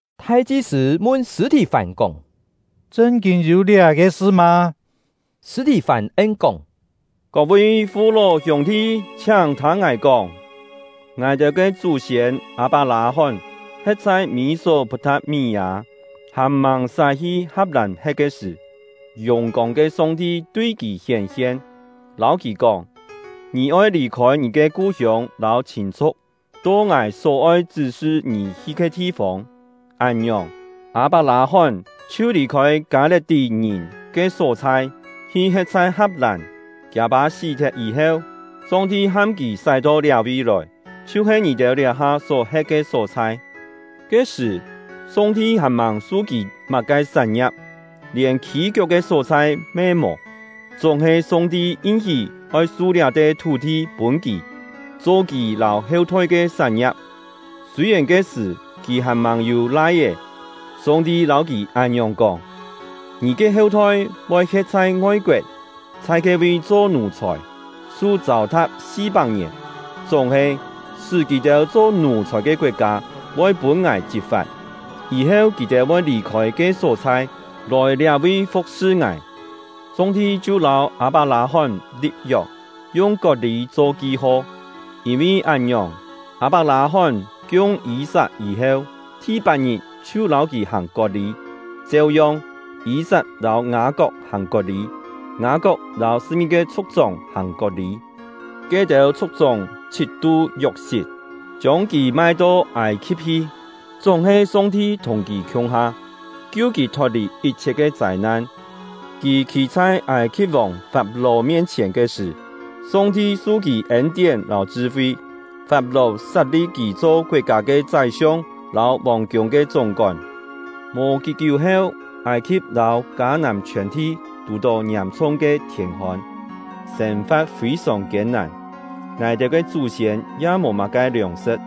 Thai-chi-sṳ̂ mun Sṳ̂-thì-fán kóng: “Chṳn-kîn yû liá-ke sṳ mâ?” Sṳ̂-thì-fán en-kóng: “Kok-vi fu-ló hiûng-thi, chhiáng thâng ngài kóng! Ngài-têu ke chú-siên Â-pak-lâ-hón he̍t chhai Mî-sok-put-tha̍t-mí-â, hàn-màng sái-hi Ha̍p-làn he̍t ke sṳ̀, yùng-kông ke Song-ti tui kì hién-hien, lâu kì kóng: ‘Ngì oi lì-khôi ngì ke ku-hiông lâu chhîn-chhu̍k, to Ngài só oi chṳ́-sṳ ngì hi ke thi-fông.’ Án-ngiòng, Â-pak-lâ-hón chhiu lì-khôi Kâ-le̍t-tí-ngìn ke só-chhai, hi he̍t chhai Ha̍p-làn. Kiâ-pâ sí-thet yî-heu, Song-ti ham kì sái-to liá-vi lòi, chhiu-he ngì-têu liá-ha só-he̍t ke só-chhai. Ke-sṳ̀, Song-ti hàn-màng su kì má-ke sán-ngia̍p, lièn khî-kiok ke só-chhai me mò; chúng-he Song-ti yin-hí oi su liá-te thú-thi pûn kì, cho kì lâu heu-thoi ke sán-ngia̍p, sûi-yèn ke-sṳ̀ kì hàn-màng yû lai-é. Song-ti lâu kì án-ngiòng kóng: ‘Ngì ke heu-thoi voi he̍t chhai ngoi-koet, chhai ke-vi cho nù-chhòi, su châu-tha̍p si-pak-ngièn. Chúng-he, sṳ́ kì-têu cho nù-chhòi ke koet-kâ voi pûn Ngài chit-fa̍t. Yî-heu kì-têu voi lì-khôi ke só-chhai, lòi liá-vi fu̍k-sṳ Ngài.’ Song-ti chhiu lâu Â-pak-lâ-hón li̍p-yok, yung kot-lî cho ki-ho. Yîn-vi án-ngiòng, Â-pak-lâ-hón kiung Yî-sat yî-heu, thi-pat-ngit chhiu lâu kì hàng kot-lî; cheu-yong, Yî-sat lâu Ngâ-kok hàng kot-lî, Ngâ-kok lâu sṳ̍p-ngi-ke chhu̍k-chóng hàng kot-lî. “Ke-têu chhu̍k-chóng chhit-tu Yok-sit, chiông kì mai-to Âi-khi̍p hi; chúng-he Song-ti thùng kì khiung-ha, kiu kì thot-lì yit-chhiet ke châi-nan. Kì khî chhai Âi-khi̍p-vòng Fap-ló mien-chhièn ke sṳ̀, Song-ti su kì ên-tién lâu chṳ-fi. Fap-ló sat-li̍p kì cho koet-kâ ke chái-siong lâu vòng-kiûng ke chúng-kón. Mò kí-kiú heu, Âi-khi̍p lâu Kâ-nàm chhiòn-thi tù-tó ngiàm-chhung ke thiên-hôn, sên-fa̍t fî-sòng kiên-nàn; ngài-têu ke chú-siên ya mò má-ke liòng-sṳ̍t.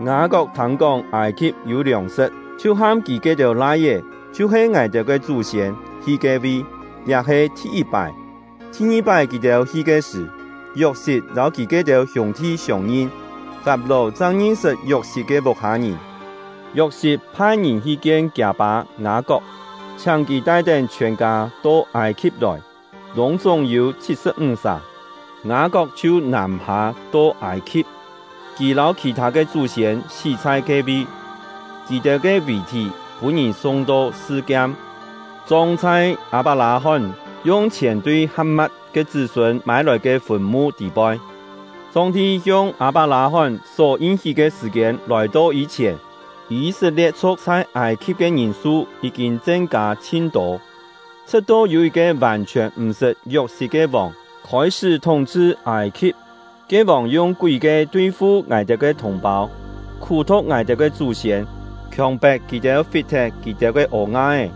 Ngâ-kok thâng-kóng Âi-khi̍p yû liòng-sṳ̍t, chhiu ham kì ke-têu lai-é, chhiu-he ngài-têu ke chú-siên, hi ke-vi; liá he thi-yit-pái. Thi-ngi-pái kì-têu hi ke sṳ̀, Yok-sit lâu kì ke-têu hiûng-thi siông-ngin; Fap-ló chang ngin-sṳt Yok-sit ke vuk-hâ-ngìn. Yok-sit phai-ngìn hi kien kiâ-pâ Ngâ-kok, chhiáng kì tai-tén chhiòn-kâ to Âi-khi̍p lòi; lûng-chúng yû chhit-sṳ̍p-ńg sà. Ngâ-kok chhiu nàm-hâ to Âi-khi̍p; kì lâu khì-thâ ke chú-siên sí chhai ke-vi. Kì-têu ke vì-thí pûn-ngìn sung-to Sṳ-kiam, chong chhai Â-pak-lâ-hón yung chhièn tui Ha̍p-mat ke chṳ́-sûn mâi-lòi ke fùn-mu tî-poi. “Song-ti hiong Â-pak-lâ-hón só yin-hí ke sṳ̀-kiên lòi-to yî-chhièn, Yî-set-lie̍t-chhu̍k chhai Âi-khi̍p ke ngìn-su yí-kîn chen-kâ chhin tô, chhṳ̍t-to yû yit-ke vàn-chhiòn m̀ sṳt Yok-sit ke vòng khôi-sṳ́ thúng-chhṳ Âi-khi̍p. Ke vòng yung kúi-kie tui-fu ngài-têu ke thùng-pâu, khú-thu̍k ngài-têu ke chú-siên, khiòng-pet kì-têu fit-thet kì-têu ke ô-nga-é,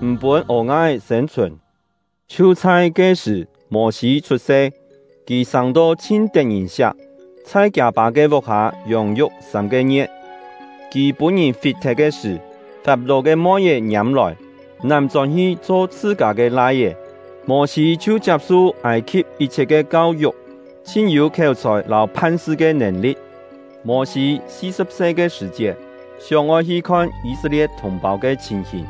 m̀ pûn ô-nga-é sên-chhùn. Chhiu chhai ke-sṳ̀, Mô-sî chhut-se; kì sâng-to chhin tet-ngìn-siak, chhai kiâ-pâ ke vuk-hâ yông-yuk sâm-ke ngie̍t. Kì pûn-ngìn fit-thet ke sṳ̀, Fap-ló ke moi-é ngiâm-lòi, nám chón-hi cho chhṳ-kâ ke lai-é. Mô-sî chhiu chiap-su Âi-khi̍p yit-chhiet ke kau-yuk, chhin yû khiéu-chhòi lâu phan-sṳ ke nèn-li̍t. “Mô-sî si-sṳ̍p se ke sṳ̀-chiet, sióng-oi hi khon Yî-set-lie̍t thùng-pâu ke chhìn-hìn.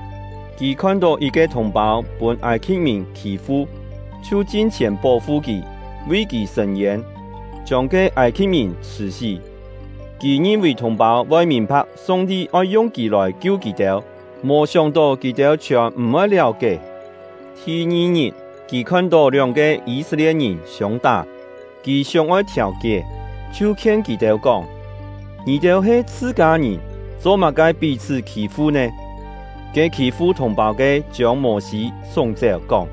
Kì khon-tó yit-ke thùng-pâu pûn Âi-khi̍p-ngìn khî-fu, chhiu chin-chhièn pó-fu kì, vi kì sṳ̂n-yên, chiông ke Âi-khi̍p-ngìn chhṳ̀-sí. Kì ngin-vì thùng-pâu voi mìn-pha̍k Song-ti oi yung kì lòi-kiu kì-têu, mò sióng-tó kì-têu chhiòn m̀-voi liáu-kié. Thi-ngi-ngit, kì khon-tó lióng-ke Yî-set-lie̍t-ngìn siông-tá. Kì sióng-oi thiàu-kié, chhiu khien kì-têu kóng: ‘Ngì-têu he chhṳ-kâ-ngìn, cho-má-ke pí-chhṳ́ khî-fu nè?’ Ke khî-fu thùng-pâu ke chiông Mô-sî súng-chéu, kóng: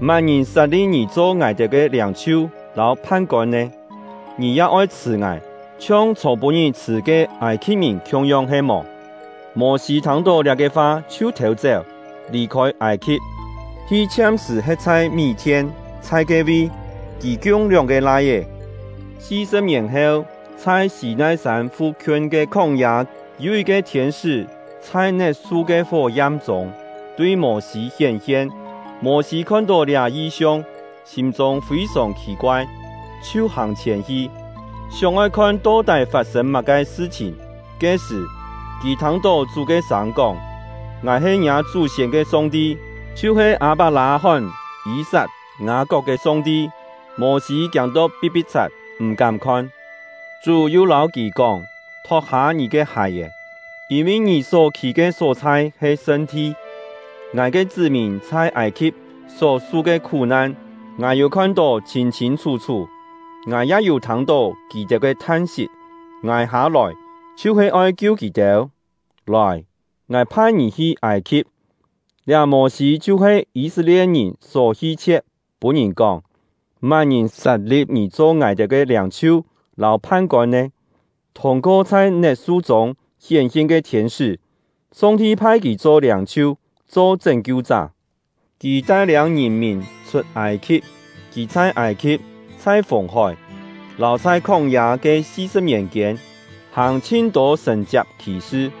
‘Má-ngìn sat-li̍p ngì cho ngài-têu ke liâng-chhiu lâu phan-kôn nè? Ngì ya oi chhṳ̀ ngài, chhiong chhô-pû-ngit chhṳ̀ ke Âi-khi̍p-ngìn khiung-yong he-mò?’ Mô-sî thâng-tó liá-ke fa chhiu thêu-chéu, lì-khôi Âi-khi̍p, hi chhiam-sṳ̀ he̍t chhai Mí-thien. Chhai ke-vi, kì kiung lióng-ke lai-é. “Si-sṳ̍p-ngièn heu, chhai Sî-nai-sân fu-khiun ke khóng-yâ, yû yit-ke thiên-sṳ́ chhai net-su ke fó-yam-chûng tui Mô-sî hién-hien. Mô-sî khon-tó liá yi-siong, sîm-chûng fî-sòng khì-koai, chhiu hàng-chhièn hi, sióng-oi khon to-tái fat-sên má-ke sṳ-chhìn. Ke-sṳ̀, kì thâng-tó Chú ke sâng kóng: ‘Ngài he ngiâ chú-siên ke Song-ti, chhiu-he Â-pak-lâ-hón, Yî-sat, Ngâ-kok ke Song-ti.’ Mô-sî kiâng-to pi̍t-pi̍t-chhat, m̀-kám khon. Chú yu lâu kì kóng: ‘Thot-hâ ngì ke hài-è! Yîn-vi ngì só khî ke só-chhai he sṳn-thi. Ngài ke chṳ́-mìn chhai Âi-khi̍p só su ke khú-nan, Ngài yû khon-tó chhîn-chhîn chhú-chhú; Ngài ya yû thâng-tó kì-têu ke than-sit. Ngài hâ-lòi, chhiu-he oi kiu kì-têu. Lòi! Ngài phai ngì hi Âi-khi̍p.’ “Liá Mô-sî chhiu-he Yî-set-lie̍t-ngìn só hi-chhie̍t, pûn-ngìn kóng: ‘Má-ngìn sat-li̍p ngì cho ngài-têu ke liâng-chhiu lâu phan-kôn nè?’ Thûng-ko chhai net-su-chûng hién-hien ke thiên-sṳ́, Song-ti phai kì cho liâng-chhiu, cho chṳ́n-kiu-chá. Kì tai-liâng ngìn-mìn chhut Âi-khi̍p; kì chhai Âi-khi̍p, chhai Fùng-hói, lâu chhai khóng-yâ ke si-sṳ̍p-ngièn-kiên, hàng chhin-tô sṳ̀n-chiak khì-sṳ.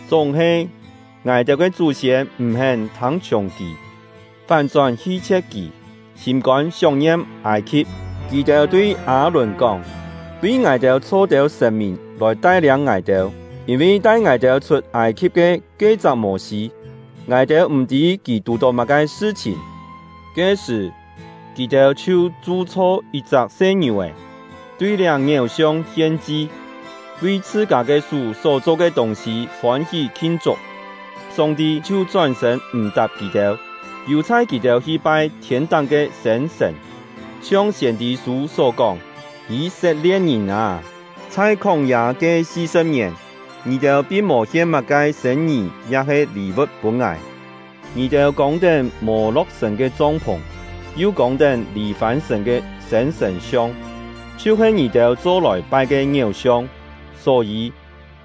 “Chúng-he, ngài-têu ke chú-siên m̀-hén thâng-chhiùng kì, fán-chón hi-chhie̍t kì, sîm-kôn sióng-ngiam Âi-khi̍p. Kì-têu tui Â-lùn kóng: ‘Vi ngài-têu chho têu sṳ̀n-mìn lòi tai-liâng ngài-têu. Yîn-vi tai ngài-têu chhut Âi-khi̍p ke ke-chak Mô-sî, ngài-têu m̀-tî kì tù-tó má-ke sṳ-chhìn.’ Ke-sṳ̀, kì-têu chhiu chu-chho yit-chak se-ngiù-è, tui liá ngiéu-siong hien-chi, vi chhṳ-kâ ke sú só cho ke tûng-sî fôn-hí khin-chuk. Song-ti chhiu chón-sṳ̂n m̀-tap kì-têu, yù-chhai kì-têu hi-pai thiên-táng ke sên-sṳ̀n, chhiong siên-tî-sû só kóng: Yî-set-lie̍t-ngìn â, chhai khóng-yâ ke si-sṳ̍p ngièn, ngì-têu pin mò hien má-ke sên-ngì ya-he lî-vu̍t pûn Ngài! Ngì-têu kông-tén Mô-lo̍k-sṳ̀n ke chong-phùng, yu kông-tén Lî-fân-sṳ̀n ke sên-sṳ̀n-siong, chhiu-he ngì-têu cho-lòi pai ke ngiéu-siong. Só-yî,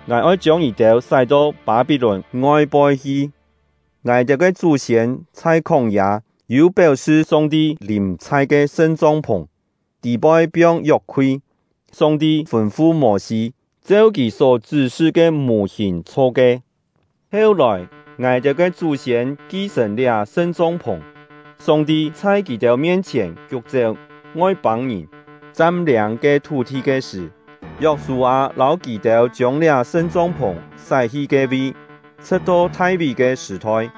Ngài oi chiông ngì-têu sái-to Pâ-pí-lùn ngoi-poi hi! “Ngài-têu ke chú-siên chhai khóng-yâ yû péu-sṳ Song-ti lìm-chhai ke sṳn-chong-phùng (tî-poi piong yok-khui), he Song-ti fûn-fu Mô-sî cheu Kì só chṳ́-sṳ ke mù-hìn chho ke. Heu-lòi, ngài-têu ke chú-siên ki-sṳ̀n liá sṳn-chong-phùng. Song-ti chhai kì-têu mien-chhièn kiuk-chéu Ngoi-pâng-ngìn, cham-liâng ke thú-thi ke sṳ̀, Yok-sû-â lâu kì-têu chiông liá sṳn-chong-phùng sái-hi ke-vi, chhṳ̍t-to Thai-ví ke sṳ̀-thoi.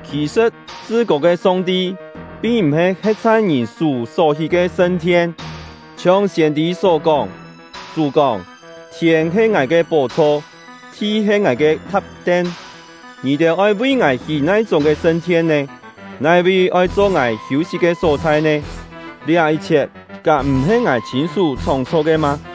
“Khì-sṳ̍t, Chṳ-kô ke Song-ti pin m̀-he he̍t chhai ngìn sú só hí ke sṳn-thien, chhiong siên-tî só kóng: Chú kóng: Thiên he Ngài ke pó-chho; thi he Ngài ke tha̍p-ten. Ngì-têu oi vi Ngài hí nai-chúng ke sṳn-thien nè? Nai-vi oi cho Ngài hiû-sit ke só-chhai nè? Liá yit-chhiet kám m̀-he Ngài chhîn-sú chhóng-chho ke mâ?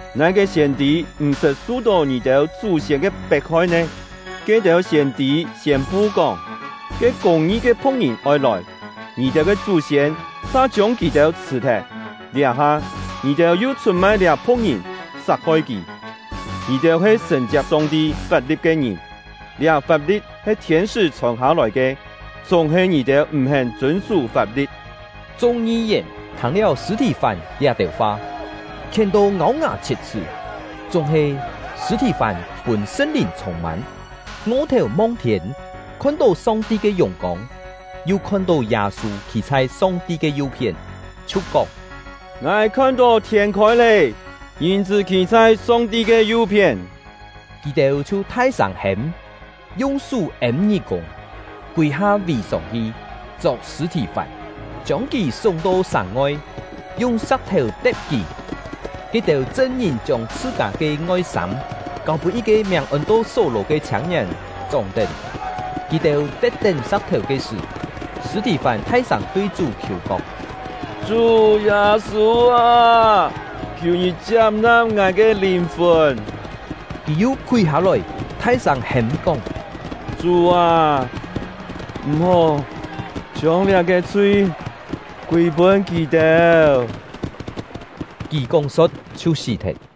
Nai-ke siên-tî m̀ sṳt su-tó ngì-têu chú-siên ke pet-hoi nè? Ke-têu siên-tî siên-pu kóng, ke Kûng-ngi ke Phu̍k-ngìn oi lòi, ngì-têu ke chú-siên sa chiông kì-têu chhṳ̀-thet; liá-ha, ngì-têu yu chhut-mai liá Phu̍k-ngìn, sat-hoi kì. Ngì-têu he sṳ̀n-chiap Song-ti fap-li̍t ke ngìn; liá fap-li̍t he thiên-sṳ́ chhòn hâ-lòi ke, chúng-he ngì-têu m̀-hén chûn-sú fap-li̍t!” Chung ngi-yèn thâng-liáu Sṳ̂-thì-fán liá-têu fa, khién-to ngâu-ngà chhiet-chhṳ́. Chúng-he, Sṳ̂-thì-fán pûn Sṳn-Lìn chhûng-mân, ngo-thèu mong-thiên, khon-tó Song-ti ke yùng-kông, yu khon-tó Yâ-sû khî chhai Song-ti ke yu-phién, chhiu kóng: “Ngài khon-tó thiên khôi lé, Ngìn-chṳ́ khî chhai Song-ti ke yu-phién!” Kì-têu chhiu thai-sâng hêm, yung sú êm ngí-kûng, kûi-ha vì-sông-hi, chok Sṳ̂-thì-fán, chiông kì súng-to sàng-ngoi, yung sa̍k-thèu te̍p kì. Ke-têu chṳn-ngìn chiông chhṳ-kâ ke ngoi-sâm kâu-pûn yit-ke miàng ôn-to Só-lò ke chhiâng-ngièn chóng-tén. Kì-têu te̍p-tén sa̍k-thèu ke sṳ̀, Sṳ̂-thì-fán thai-sâng tui Chú khiù kóng: “Chú Yâ-sû â, khiù ngì chiap-na̍p ngài ke lìn-fùn!” Kì yu khúi hâ-lòi, thai-sâng hêm-kóng: “Chú â, m̀-hó chiông liá-ke chhui kûi-pûn kì-têu!” Kì kóng-so̍t, chhiu sí-thet.